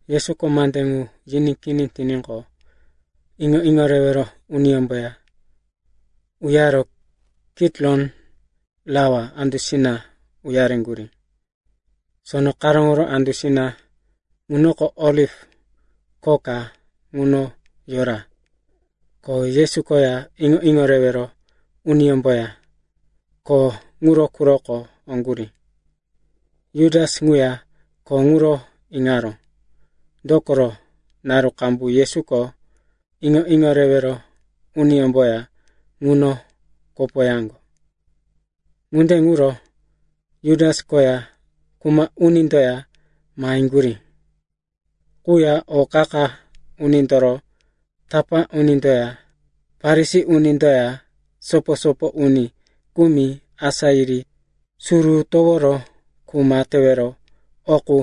Yesuko mande ŋu yiní kini tiníqo, iŋo-iŋo rewero uniyómboya uyaro Kitiron Rawa andusina uyaŋgurí. Sono karóŋo andusina ŋunoko oliv kho ka ŋuno yora, ko Yesu koya iŋo-iŋo rewero uniyómboya kho ŋuro quroko oŋgurí. Jutas ŋuya kho ŋuro iŋaró, dokoro, naru qambu Yesuko iŋo-iŋo rewero uniyómboya ŋuno kopoyaŋgo. Ŋunde ŋuro Jutas koya kuma unindoya maheŋgurí. Ŋuya o qa-qa unindoro tapá unindoya Farisi unindoya sopo-sopo uni kumi asá yiri suru toworo kuma tewero o qu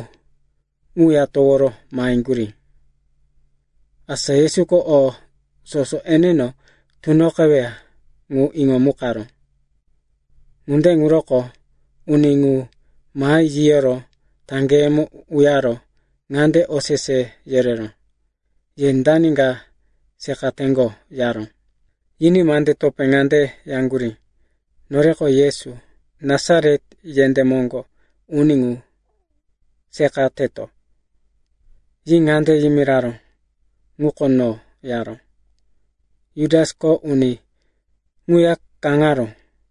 ŋuya toworo maheŋgurí. Asa Yesuko o soso eneno tunoqeweya ŋu iŋomukaró. Ŋunde ŋuro uni ŋu mahi yiyoro taŋgeyemo uyaro ŋande osese yereró, “Ye dani ka seqateŋgo?” yaró. Yiní mande topé ŋande yaŋgurí, “Noreko Yesu, Nasaret yendé moŋgo uni ŋu seqateto.” Yi ŋande yimiraró, “Ŋuko no,” yaró. (Jutasko uni ŋuya kaŋaró.)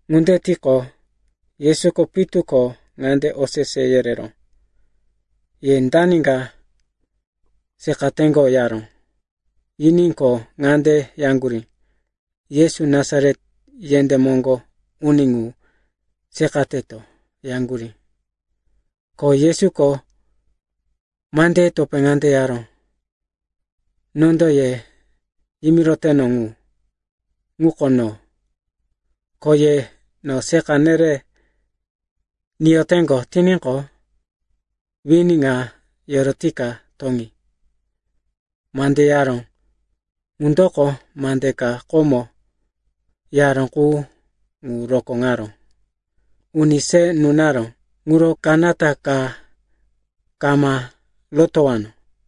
Ŋunde tiqo, Yesuko pitu ko ŋande osese yereró, “Ye dani ka seqateŋgo?” yaró. Yiní ko ŋande yaŋgurí, “Yesu, Nasaret yendé moŋgo uni ŋu seqateto,” yaŋgurí. Ko Yesuko mandeye topé ŋande yaró, “Nondo ye yimiroteno ŋu, ŋuko no. Ko ye no seqa nere niyoteŋgo tiníqo, wini ŋa yorotika toŋi.” Mande yaró ŋundoko mande ka komo yaró qu ŋu rokóŋaró, “Uni se nunaró ŋuro kanata ka kama rotowano.”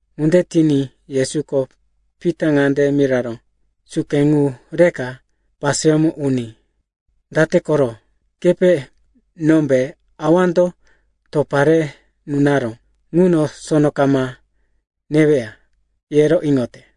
Ŋunde tiní Yesuko Pita ŋande miraró, “Suke ŋu reka paseyómo uní. Date koro? Kepe nombe Awando topa re nunaró ŋuno sono kama neweya, yero iŋote?”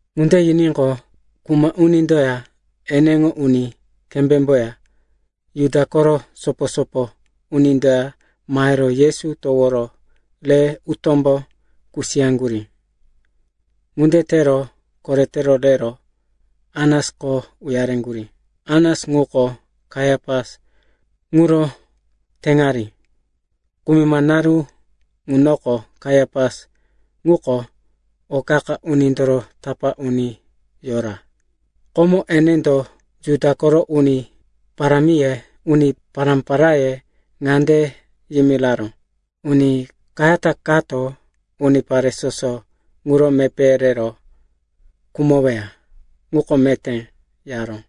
Ŋunde yiníqo, kuma unindoya eneŋo uni kembémboya Juda koro sopo-sopo unindoya mahero Yesu toworo re utómbo kusiyaŋgurí. Ŋunde tero korete rero Anasko uyareŋgurí. Anas ŋuko Kaiapas ŋuro teŋari. Kumima naru ŋunoko Kaiapas ŋuko o qa-qa unindoro tapá uni yora. Komo enendo Juda koro uni pará-paráye ŋande yimiraró, “Uni kayata kato unipare soso ŋuro mepéye rero khumoweya ŋuko meté,” yaró.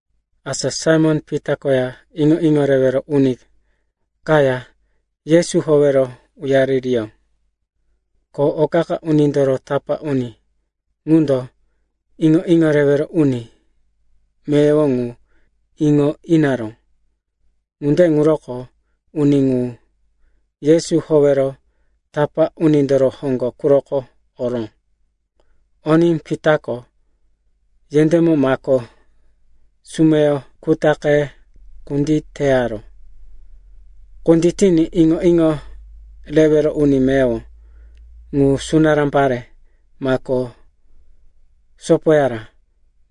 Asa Saimon-Pita koya iŋo-iŋo rewero uni kaya Yesu howero uyaririyó. O qa-qa unindoro tapá uni ŋundo iŋo-iŋo rewero uni meyowo ŋu iŋo inaró. Ŋunde ŋuroko uni ŋu Yesu howero tapá unindoro hoŋgo quroko oró. Oní Pitako yendémo mako sumeyo kutaqe kunditeyaró. Kunditiní iŋo-iŋo rewero uni meyowo ŋu sunará pare mako sopoyara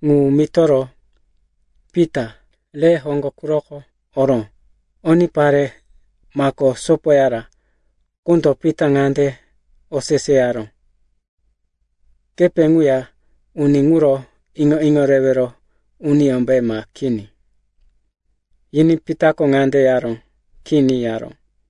ŋu mitoro Pita re hoŋgo quroko oró. Oní pare mako sopoyara ŋundo Pita ŋande oseseyaró, “Kepe ŋuya uni ŋuro iŋo-iŋo rewero uniyómbe, ma kini?” Yiní Pitako ŋande yaró, “Kini,” yaró.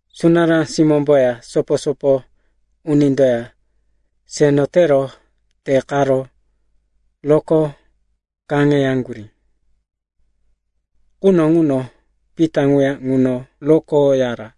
Sunará simómboya sopo-sopo unindoya seno tero te qaro roko kaŋeyaŋgurí. Quno ŋuno Pita ŋuya ŋuno rokoyara.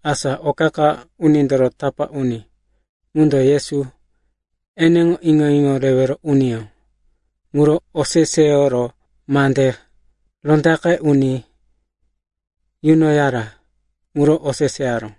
Asa o qa-qa unindoro tapá uni ŋundo Yesu eneŋo iŋo-iŋo rewero uniyó ŋuro oseseyoro mande rondaqe uni yunoyara ŋuro oseseyaró.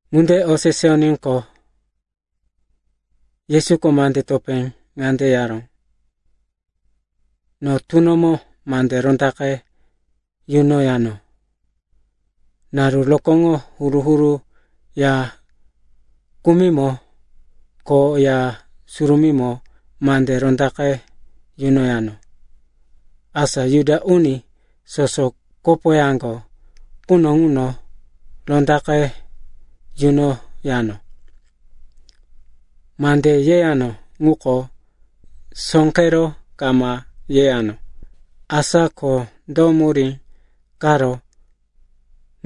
Ŋunde oseseyoníqo, Yesuko mande topé ŋande yaró, “No tunomo mande rondaqe yunoyano. Naru rokóŋo huru-huru ya kumimo ko Ya Surumímo mande rondaqe yunoyano, asa Juda uni soso kopoyaŋgo quno ŋuno rondaqe yunoyano. Mande yeyano ŋuko sóqero kama yeyano. Asa ko do murí karo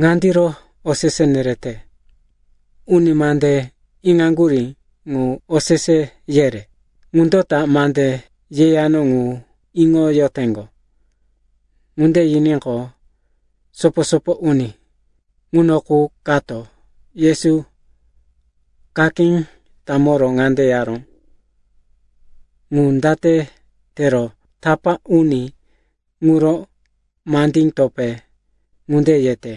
ŋandiro osese nereyote? Uni mande iŋaŋgurí ŋu osese yere. Ŋundo ta mande yeyano ŋu iŋoyoteŋgo.” Ŋunde yiníqo, sopo-sopo uni ŋuno qu kato Yesu kakí tamoro ŋande yaró, “Ŋu date tero tapá uni ŋuro mande topé ŋunde yete?”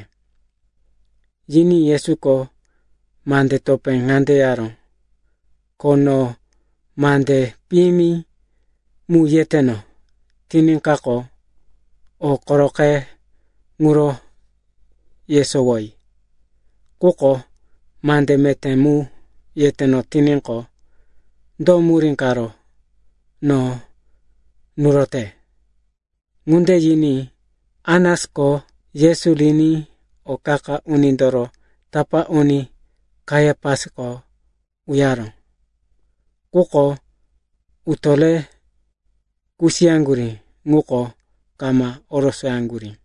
Yiní Yesuko mande topé ŋande yaró, “Ko no mande piyimi mu yeteno tiníkaqo, o koroqe ŋuro yesowoyi. Quko mande meté mu yeteno tiníqo, do murí karo no nurote?” Ŋunde yiní Anasko Yesu riní o qa-qa unindoro tapá uni Kaiapasko uyaró. Quko utó re kusiyaŋgurí ŋuko kama orosoyaŋgurí.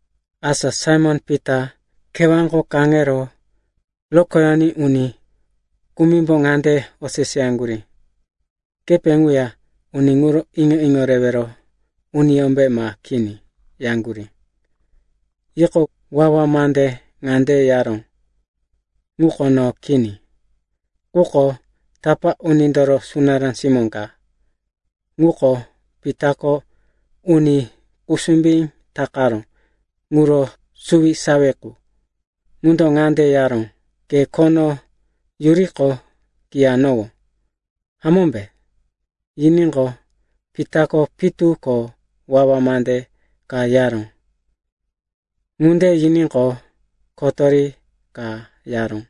Asa Saimon-Pita kewáko kaŋero rokoyoní uni kumimbo ŋande oseseyaŋgurí, “Kepe ŋuya uni ŋuro iŋo-iŋo rewero uniyómbe, ma kini?” yaŋgurí. Yiqo, wawa mande ŋande yaró, “Ŋuko no kini.” Quko tapá unindoro sunará simó ka, ŋuko Pitako uni kusumbí takaró ŋuro suwisawi qu, ŋundo ŋande yaró, “Ke khono yuriqo, kiyanowó, hamómbe?” Yiníqo, Pitako pitu ko wawa mande ka yaró. Ŋunde yiníqo, kotori ka yaró.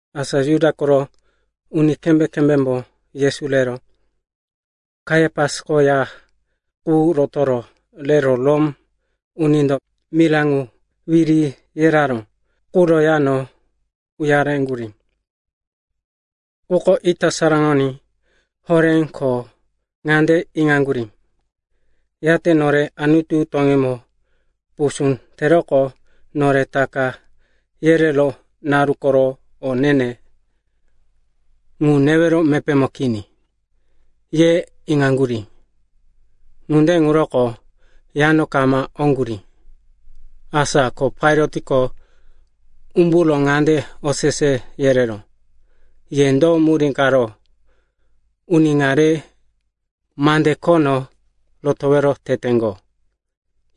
Asa Juda koro uni kembé-kembémbo Yesu rero Kaiapasko ya qu rotoro rero Rom unindo mira ŋu wiri yereyaró ŋuro yano uyareŋgurí. Ŋuko ita saraŋoní horé ko ŋande iŋaŋgurí, “Yate nore Anutu toŋímo pusú teroqo nore Taka yereró naru koro o ne-ne ŋu newero mepémo kini,” ye iŋaŋgurí. Ŋunde ŋuroko yano kama oŋgurí. Asa ko Pailatko umburo ŋande osese yereró, “Ye do murí karo uni ŋa re mande khono rotowero teteŋgo?”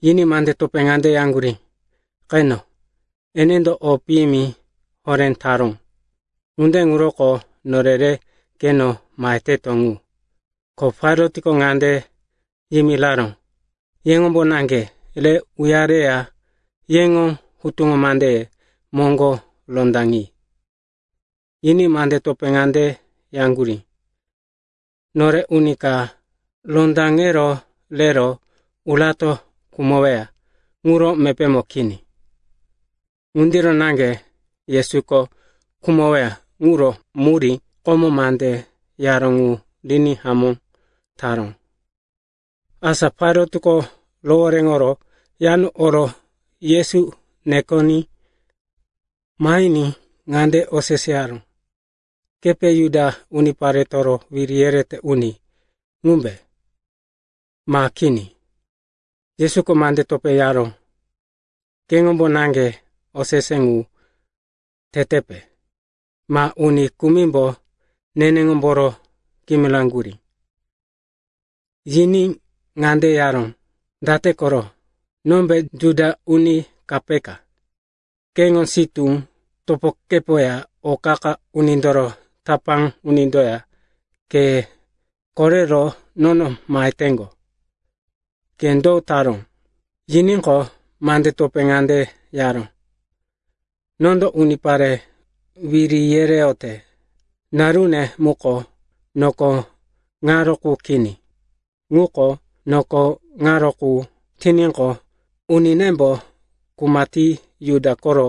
Yiní mande topé ŋande yaŋgurí, “Qeno, enendo o piyimi horé taró. Ŋunde ŋuroko nore re keno maheteto ŋu.” Ko Pailatko ŋande yimiraró, “Yeŋombo naŋge re uyareya yeŋo hutuŋo mandeye moŋgo rondaŋi.” Yiní mande topé ŋande yaŋgurí, “Nore uni ka rondaŋero rero urato khumoweya ŋuro mepémo kini.” Ŋundiro naŋge Yesuko khumoweya ŋuro murí komo mande yaró ŋu riní hamó taró. Asa Pailatko rohoréŋoro yano oro Yesu nekoní mahiní ŋande oseseyaró, “Kepe Juda uniparetoro wiri yerete uni ŋumbe, ma kini?” Yesuko mande topé yaró, “Keŋombo naŋge osese ŋu tetepe, ma uni kumimbo nenemboro kimiraŋgurí?” Yiní ŋande yaró, “Date koro? Nombe Juda uni ka peka? Keŋo sitú topokepoya o qa-qa unindoro tapá unindoya ke korero nono maheteŋgo. Ke do taró?” Yiníqo, mande topé ŋande yaró, “Nondo unipare wiri yereyote narune muko noko ŋaro qu kini. Ŋuko noko ŋaro qu tiníqo, uninembo kuma ti Juda koro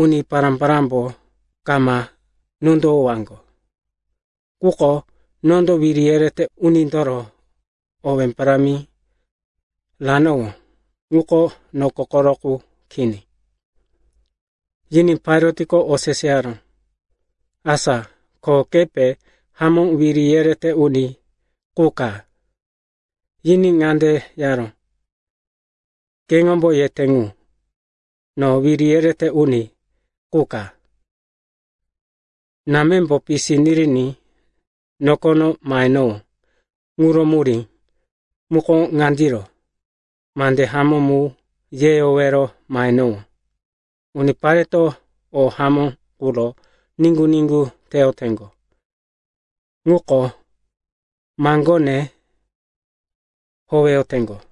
uni pará-parámbo kama nondowowaŋgo. Quko nondo wiri yerete unindoro owé parámi ranowó ŋuko noko koro qu kini.” Yiní Pailatko oseseyaró, “Asa ko kepe hamó wiri yerete uni qu ka?” Yiní ŋande yaró, “Keŋombo yete ŋu, no wiri yerete uni qu ka. Námembo pisi niriní nokono mahenowó ŋuro murí muko ŋandiro: mande hamó mu yeyowero mahenowó. Unipareto o hamó quro niŋgu-niŋgu teyoteŋgo ŋuko maŋgone howeyoteŋgo.”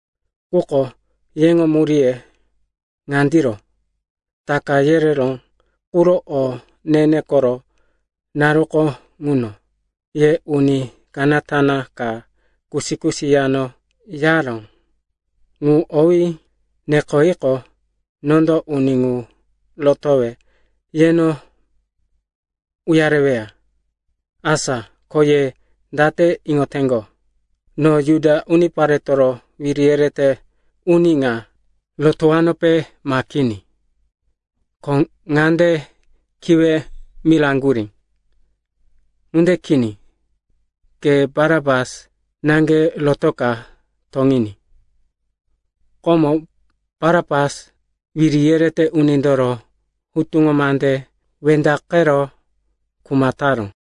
Quko yeŋo muríye ŋandiro: Taka yereró quro o ne-ne koro naruko ŋuno, ye uni kanata ka kusi-kusi yano yaró ŋu owí nekoyiqo, nondo uni ŋu rotowe yeno uyareweya. Asa ko ye date iŋoteŋgo, no Juda uniparetoro wiri yerete uni ŋa rotowanope, ma kini?” Ko ŋande kiwe miraŋgurí, “Ŋunde kini! Ke Barapas naŋge rotoka toŋiní!” Komo Barapas wiri yerete unindoro hutuŋo mande wendaqero kuma taró.